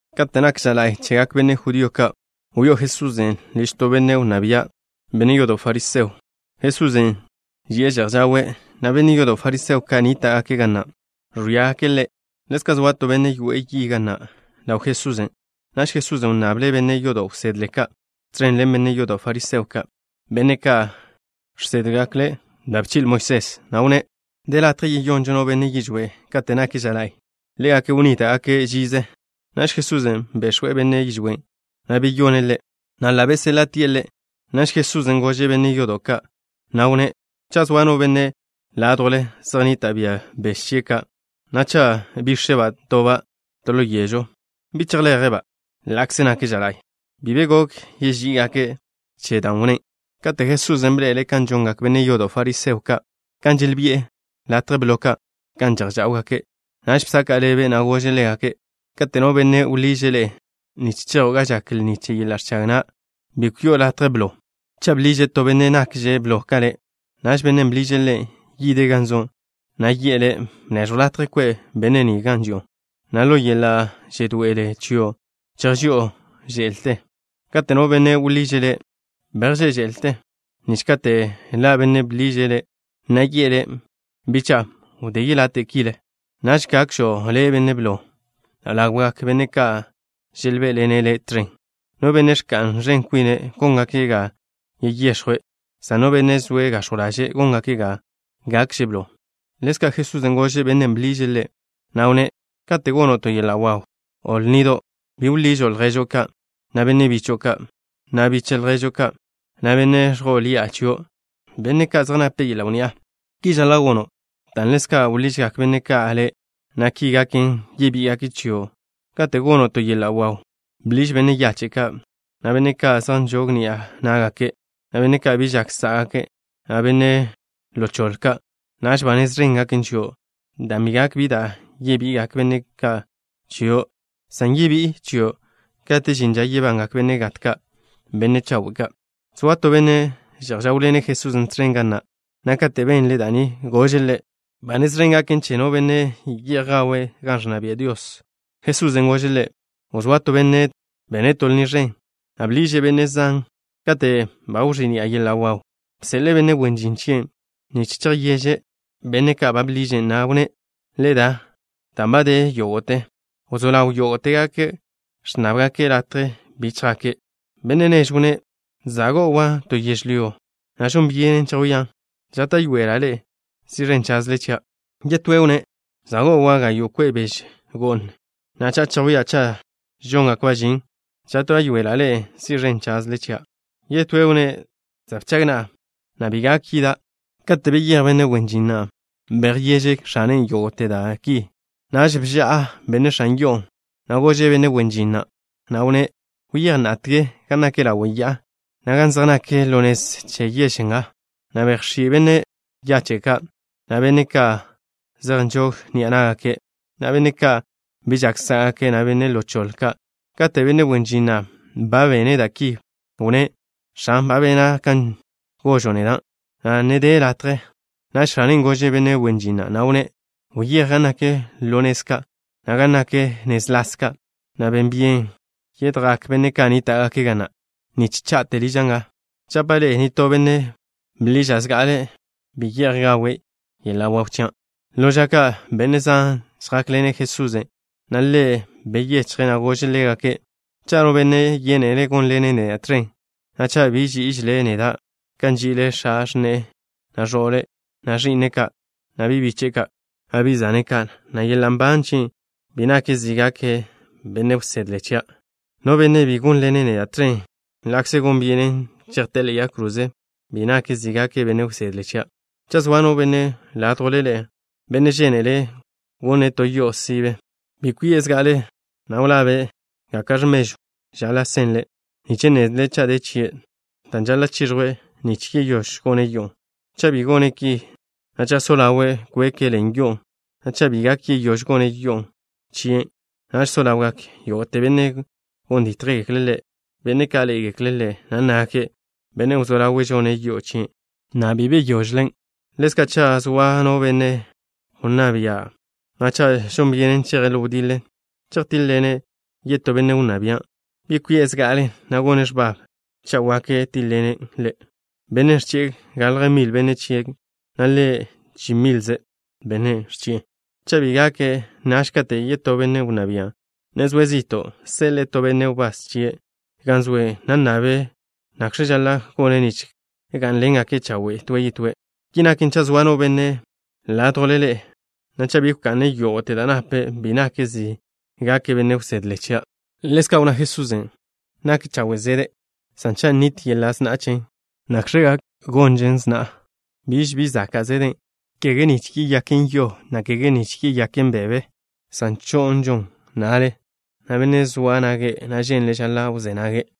Kate' nak ža la'y chegak benne' judío ka', wyó'o Jesusen' liž to benne' wnná bia', benne' yodo' fariseo. Jesusen' ži'e že'j žawe', na' benne' yodo' fariseo ka' nníta'gake' ga na' ẕwíagake' Ḻe'. Ḻezka' zoa to benne' yoe'e yi ga na' ḻaw Jesusen'. Naž Jesusen' wnnable' benne' yodo' wsedle ka' tẕen ḻen benne' yodo' fariseo ka', benne' ka' žsédgekle' da' bchi'le Moisés, na' wnné': —¿De latje yeyonžo no benne' yižwé' kate' nak ža la'y? Ḻégake' wnníta'gake' žize. Naž Jesusen' bex̱we' benne' yižwén', na' beyone' ḻe', na' ḻa' beséḻa'tie' ḻe'. Naž Jesusen' gože' benne' yodo' ka', na' wnné': —Cha' zoa no benne' ládjwle, zej nnita' bia beže chie' ka', na' cha' bíx̱eba' toba' to ḻo yežw, ¿bi chejleje'-ba', ḻa'kze nak ža la'y? Bi be gok yeží'igake' che dan' wnnén'. Kate' Jesusen' bḻe'ele' kan žongak benne' yodo' fariseo ka', kan želbi'e latje blo ka' gan že'j žáwgake', naž bsaka' ḻebe', na' gože' ḻégake': —Kate' no benne' wḻiže' le' nich chejo' ga žak lni che yeḻa' ẕchag na', bi kwi'o latje blo. Cha' bḻiže' to benne' nakže' blo ka le', naž bennen' bḻiže' le' yide' gan zo', na' yi'e le': “Bneẕjw latje kwe' benne' ni gan ži'o” na' ḻo yeḻa' žedoe'ele chio' chejži'o že'lte. Kate' no benne' wḻiže' le', bejžé' že'lte, nich kate' ḻa' bennen' bḻiže' le', na' yi'e le': “Bicha'a, wdé yelate' kile.” Naž gakžo' le' blo ḻawgak benne' ka' želbé'ḻene' le' tẕen. No benne' ẕka'n ẕen kwine', góngake' ga yeyex̱jwe', san no benne' zoe' gax̱jw ḻaže', góngake' ga gakže' blo. Ḻezka' Jesusen' gože' bennen' bḻiže' Ḻe', na' wnné': —Kate' gono' to yeḻa' waw, o lnido', bi wḻižo' lježo' ka', na' benne' bicho'o ka', na' biche' lježo' ka', na' benne' ẕjo'o ḻi'a chio' ka', benne' ka' zej nape' yeḻa' wnni'a. Ki žaḻa' gono' dan' ḻezka' wḻižgak benne' ka' le', na' ki gaken, yebí'igake' chio'. Kate' gono' to yeḻa' waw, bḻiž benne' yache' ka', na' benne' ka' zej nžog ni'a ná'gake', na' benne' ka' bi žak sá'gake', na' benne' ḻo choḻe ka'. Naž ba nez ẕen gaken chio', dan' bi gak bi da' yebi'igak benne' ki chio', san yebí'i chio' kate' žin ža yebangak benne' gat ka', benne' chawe' ka'. Zoa to benne' že'j žáwḻene' Jesusen' tẕen ga na', na' katen' benle' da' ni, gože' Ḻe': —Ba nez ẕen gaken che no benne' ye'j gawe' gan ẕnna bia' Dios. Jesusen' gože' ḻe': —Wzóa to benne' bene' to lni ẕen, na' bḻiže' benne' zan. Kate' ba wẕí'ni'a yeḻa' waw, bseḻe'e benne' wen žin chie' nich chejyeže' benne' ka' ba bḻiže', na' wnné': “Le da, dan' ba de yógo'te.” Wzó ḻaw yógo'tegake' ẕnnábgake' latje bi chjake'. Benne' nežwn' wnné': “Za' go'wa' to yežlyó, na' žon byenen chejwían'. Žáta'yoela' le' si' ẕen chaze' chia'.” Yetóen' wnné': “Za' go'wa' gayo' kwe' bež go'n, na' cha'a chejwía' cha' žóngakba' žin. Žáta'yoela' le' si' ẕen chaze' chia'.” Yetóen' wnné': “Za' bchag na'a, na' bi gak yida'.” Kate' beyéj benne' wen žin na', bejyeže' x̱ane' yógo'te da' ki. Naž bža'a benne' x̱an yo'on', na' gože' benne' wen žin na', na' wnné': “Wyéj na'atge gan nak ḻawe' ya'a, na' gan zej nak ḻo nez che yež nga, na' bejx̱í' benne' yache' ka', na' benne' ka' zej nžog ni'a ná'gake', na' benne' ka' bi žak sá'gake', na' benne' ḻo choḻe ka'.” Kate' benne' wen žin na' ba bene' da' ki, wnné': “X̱an, ba bena' kan gožo' neda', na' ne de latje.” Naž x̱ane' gože' benne' wen žin na', na' wnné': “Wyéj gan nak ḻo nez ka', na' gan nak nez las ka', na' ben byene yidgak benne' ka' nníta'gake' ga na', nich cha'te liža' nga. Žapa' ḻe'e: nitó benne' bḻiža' zga'ale bi ye'j gawe' yeḻa' waw chia'.” Ḻo ža ka' benne' zan žjákḻene' Jesusen', na' Ḻe' beyechje', na' gože' ḻégake': —Cha' no benne' yénele' gónḻene' neda' tẕen, na' cha' bi ží'ižele' neda' ka nži'ile' x̱a x̱ne'e, na' ẕo'le', na' ẕi'ne' ka', na' bi' biche'e ka', na' bi' zane' ka', na' yeḻa' nban chie', bi nake' zi gake' benne' wsedle chia'. No benne' bi gónḻene' neda' tẕen ḻa'kze gon byenen chejté'e ḻe'e yag kroze, bi nake' zi gake' benne' wsedle chia'. Cha' zoa no benne' ládjwle ḻe'e, benne' žénele' gone' to yo'o sibe, ¿bi kwi'e zga'ale, na' wlabe' gaka'x̱ mežw žaḻa' senle', nich nnezle' cha' de chie' da' žaḻa' chiẕjwe' nich yeyóž gone' yo'on'? Cha' bi gone' ki, na' cha' so ḻawe' kweke' ḻen yo'on', na' cha' bi gak yeyóž gone' yo'o chien', naž so ḻawgak yógo'te benne' gon dítjgekle' ḻe', benne' ka' ḻé'egeklen', na' nnágake': “Bennen' wzó ḻawe' žone' yo'o chien', na' bi gok yeyóž gonen'.” Ḻezka', cha' zoa no benne' wnná bia', na' cha' žon byenen cheje' ḻo wdiḻe chejtíḻ-ḻene' yetó benne' wnná bia', ¿bi kwi'e zga'ale, na' gone' x̱bab cha' wak chejtíḻ-ḻene' bennen' ẕchi'e galje mil benne' chie', na' ḻe' chi milze benne' ẕchi'e? Cha' bi gake', naž katen' yetó benne' wnná bian' ne zoe' zi'to', seḻe'e to benne' wbás chie' gan zoe', na' nnabe' nakx̱ žaḻa' gone' nich gá'nḻengake' chawe' toe' yetóe'. Ki naken, cha' zoa no benne' ládjwle ḻe'e, na' cha' bi wka'ne' yógo'te da' nape', bi nake' zi gake' benne' wsedle chia'. Ḻezka' wnná Jesusen': —Nak chawe' zede', san cha' nit yeḻa' sna'a chen, ¿nakx̱ gak yeyonžon sna'a? Biž bi zaka' zeden', kege nich yeyonen yo, na' kege nich yeyonen bebe, san cho'nžon na'le. No benne' zoa nage', na' ženle', žaḻa' wzé nage'.